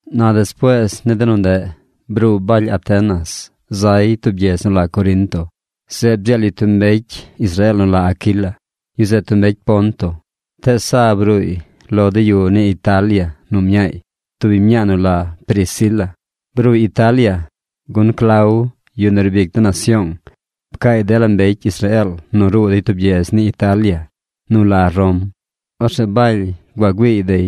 Na despuees ni de nu ndeꞌ, bruu Baly Atenas, zay tub gyedz nu la Corinto. Zeꞌ bdzeel yu tub mbecy Israeel nu la Aquila. Yu zeꞌ tub mbecy Ponto, tees sa bruuy lo de yu ni Italia nu mñaay, tub biñ mñaa nu la Priscila. Bruuy Italia, gun Clau, yu nu riib ic de nasyoong, pcaay dela mbecy Israeel nu ruu dey tub gyedz ni Italia nu la Rom. Orzeꞌ Baly gua güiiy dey.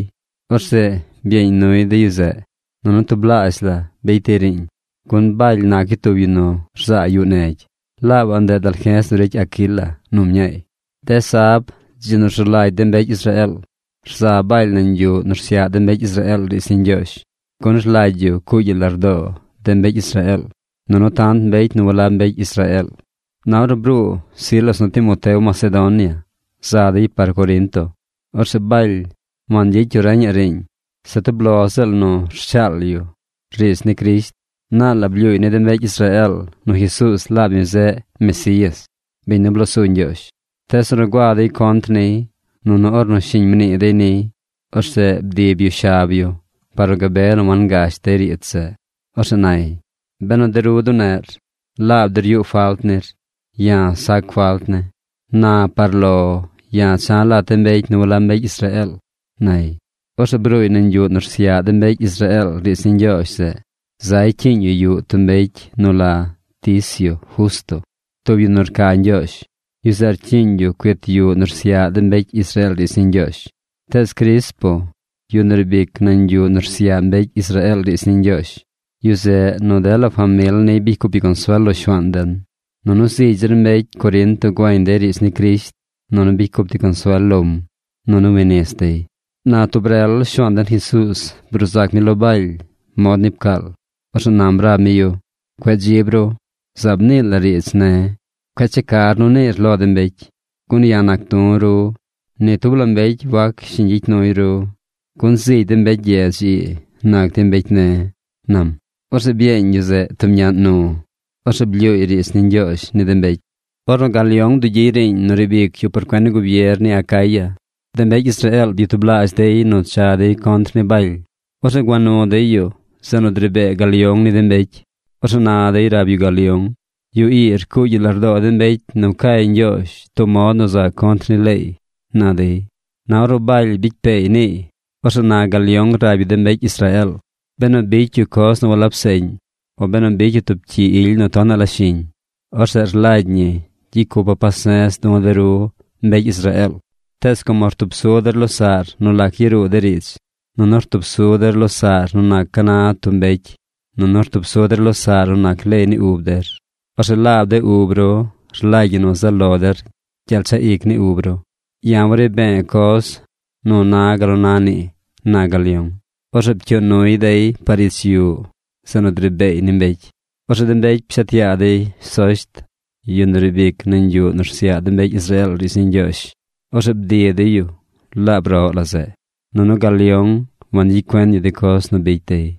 Orzeꞌ byeeñ nuy de yu zeꞌ, nunu tublaazh la bicy dey riiñ, gun Baly nac yu tub yu nu rzaa yuꞌ negy. Laabaꞌ ndeꞌ dalje̱z nu ricy Aquila nu mñaay. De sab, dzi nu rzu lagy de mbecy Israeel, rza Baly nañ yuꞌ nu rsyaꞌ de mbecy Israeel riidz ni Ñgyoozh, gun rlagy yu cuugy yu lardoo de mbecy Israeel, nunu tant mbecy nu walab mbecy Israeel. Na ornu bruu Silas nu Timoteo Macedonia za dey par Corinto. Orzeꞌ Baly wangyicy yu reñaꞌ riiñ. Se tub lo ziꞌl nu rshaal yu riidz ni Crisht. Naal la blyuuy ni de mbecy Israeel nu Jesuuz laab mi zeꞌ Mesías, biñ nu bloo su Ñgyoozh. Tees ornu gua dey contr niy, nunu ornu shiñ mnii dey niy, orzeꞌ bdib yu shab yu par nu gabe nu wangash dey riidz zeꞌ. Orzeꞌ nay: ―Benu de ru duneꞌr, laab der yuꞌ falt nir. Ya̱ sac falt ne̱. Na par lo ya̱ cha̱ lat de mbecy nu walab mbecy Israeel ―nay. Orzeꞌ bruuy nañ yuꞌ nu rsyaꞌ de mbecy Israeel riidz ni Ñgyoozh zeꞌ, zay cyiiñ yu yuꞌ tub mbecy nu la Ticio Justo, tub yu nu rca Ñgyoozh. Yu zeꞌ rcyiiñ yu cuit yuꞌ nu rsyaꞌ de mbecy Israeel riidz ni Ñgyoozh. Tees Crispo, yu nu riib ic nañ yuꞌ nu rsyaꞌ mbecy Israeel riidz ni Ñgyoozh, yu zeꞌ nu dela famil niy bicy cup yu consuel lo Shuaan den. Nunu zigy zir mbecy Corinto güeñ dey riidz ni Crisht, nunu bicy cup dey consuel lom, nunu wi nis dey. Na tub rel Shuaan den Jesuuz bruu zac mi lo Baly mod ni pcaal. Orzeꞌ nam rab mi yu: ―Cueꞌ dzib ru. Zaab nii lar riidz ne̱. Cueꞌ checar nu niir lo de mbecy. Gun ya̱ nac du̱ ru. Ni tub la mbecy wac shiñ gyicy nuy ru, gun zigy de mbecy gyedz ii nac dey mbecy ne̱ ―nam. Orzeꞌ byeeñ yu zeꞌ tub ñaꞌn nu. Orzeꞌ blyuuy riidz ni Ñgyoozh ni de mbecy. Ornu Galión bdugyiy riiñ nu riib ic yu por cuen ni gubier ni Acaya, de mbecy Israeel byatublaazh dey nu cha dey contr ni Baly. Orzeꞌ gua nu dey yu zeꞌ nu dri bee Galión ni de mbecy. Orzeꞌ na dey rab yu Galión: ―Yu ii rcuugy yu lardoo de mbecy nu cay Ñgyoozh tub mod nu za contr ni leey ―na dey. Na ornu Baly bicy peey niiy, orzeꞌ na Galión rab yu de mbecy Israeel: ―Benu bicy yu coz nu walab seꞌñ, o benu bicy yu tub cyi ily nu tonaꞌ la shiñ, orzeꞌ rlagy ñi gyicy cupa̱ pase̱z du̱ de ru mbecy Israeel. Tees como rtub su der losaꞌr nu lac yaruu de riidz, nunu rtub su der losaꞌr nu nac ca na tub mbecy, nunu rtub su der losaꞌr nu nac leey ni ub der, orzeꞌ laab de ub ru rlagy ñi nu zaꞌ lo der gyel chaꞌ ic ni ub ru. Ya̱ wari be̱e̱ coz nu na gal nu na nii ―na Galión. Orzeꞌ pcyuu nuy dey par ich yuꞌ zeꞌ nu dri beey ni mbecy. Orzeꞌ de mbecy pshet yaa dey Sosht, yu nu riib ic nañ yuꞌ nu rsyaꞌ mbecy Israeel riidz ni Ñgyoozh. Orzeꞌ bdi dey yu laab roꞌ la zeꞌ. Nunu Galión wangyicy cuen yu de coz nu bicy dey.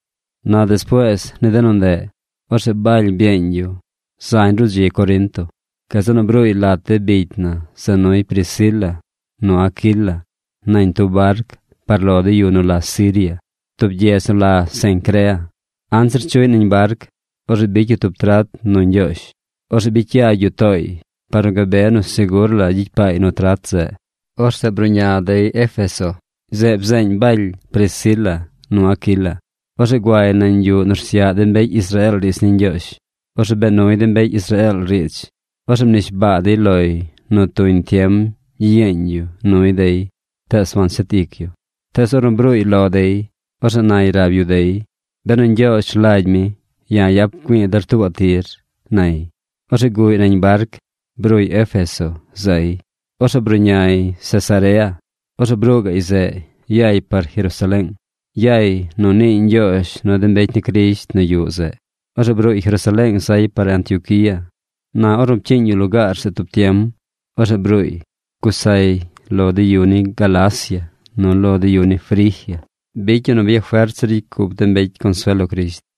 Na despuees ni de nu ndeꞌ, orzeꞌ Baly byeeñ yu zañ ruꞌ dzi Corinto. Gazeꞌ nu bruuy lat de bicy na za nuy Priscila nu Aquila nañ tub barc par lo de yu nu la Siria. Tub gyedz nu la Cencrea, anzir chuꞌy nañ barc, orzeꞌ bicy yu tub trat nu Ñgyoozh. Orzeꞌ bicy yagy yu tooy par nu gabe nu segur la gyicy paay nu trat zeꞌ. Orzeꞌ bruꞌña dey Éfeso. Zeꞌ bzeeñ Baly Priscila nu Aquila. Orzeꞌ guay nañ yuꞌ nu rsyaꞌ de mbecy Israeel riidz ni Ñgyoozh. Orzeꞌ bee nuy de mbecy Israeel riidz. Orzeꞌ mnishbaa dey loy nu tuñ tiem gyiyeeñ yu nuy dey tees wanshet ic yu. Tees ornu bruuy lo dey, orzeꞌ nay rab yu dey: ―Benu Ñgyoozh rlagy mi, ya̱ yap güi̱i̱ der tuubaꞌ tir ―nay. Orzeꞌ guꞌy nañ barc. Bruuy Éfeso zay. Orzeꞌ bruꞌñay Cesarea. Orzeꞌ bruu gaꞌy zeꞌ yay par Jerusaleeng. Yay nu niiy ñgyoozh nu de mbecy ni Crisht nu yuꞌ zeꞌ. Orzeꞌ bruuy Jerusaleeng zay par Antioquía. Na ornu pcyiiñ yu lugaar zeꞌ tub tiem, orzeꞌ bruuy. Gusay lo de yu ni Galacia nu lo de yu ni Frigia. Bicy yu nu byafert zir ricy cup de mbecy consuel lo Crisht.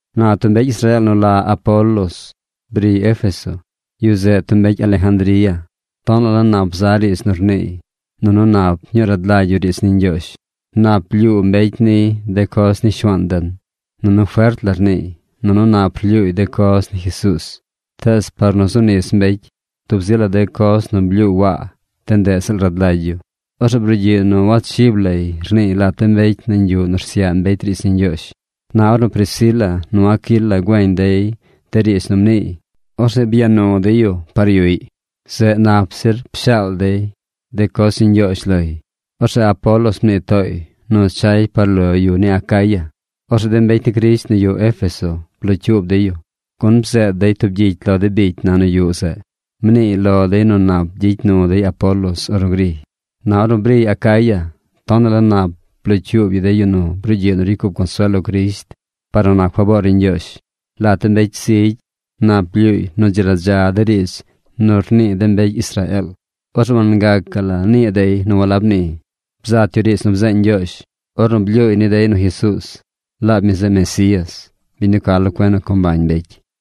Na tub mbecy Israeel nu la Apolos briy Éfeso. Yu zeꞌ tub mbecy Alejandría. Tonaꞌ la nap za riidz nu rniiy, nunu nap ñuu rad lagy yu riidz ni Ñgyoozh. Nap blyuu mbecy niy de coz ni Shuaan den. Nunu fert la rniiy, nunu nap rlyuuy de coz ni Jesuuz. Tees par nu zu nis mbecy, tub zi la de coz nu blyuu Waa, de ndeꞌ ziꞌl rad lagy yu. Orzeꞌ brugyiꞌ nu wachib lay rniiy lat de mbecy nañ yuꞌ nu rsyaꞌ mbecy riidz ni Ñgyoozh. Na ornu Priscila nu Aquila güeñ dey de riidz nu mniiy, orzeꞌ gua nu dey yu par yuꞌy. Zeꞌ nap zir pshaal dey de coz ni Ñgyoozh loy. Orzeꞌ Apolos mnii tooy nu chay par lo yu ni Acaya. Orzeꞌ de mbecy ni Crisht nu yuꞌ Éfeso blocyuub dey yu, gun bzeed dey tub gyicy lo de bicy na nu yuꞌ zeꞌ. Mniiy lo dey nu nap gyicy nu dey Apolos ornu griy. Na ornu briy Acaya, tonaꞌ la nap blocyuub yu de yu nu brugyiꞌ nu ricy cup consuel lo Crisht par nu nac faboor ni Ñgyoozh. Lat de mbecy zigy nap blyuuy nu dzi radza de riidz nu rnii de mbecy Israeel. Orzeꞌ wangacaꞌ nii dey nu walab ni. Bzat yu riidz nu bzeeñ Ñgyoozh, ornu blyuuy ni dey nu Jesuuz, laab mi zeꞌ Mesías, biñ nu ca lo cuen nu co mbañ mbecy.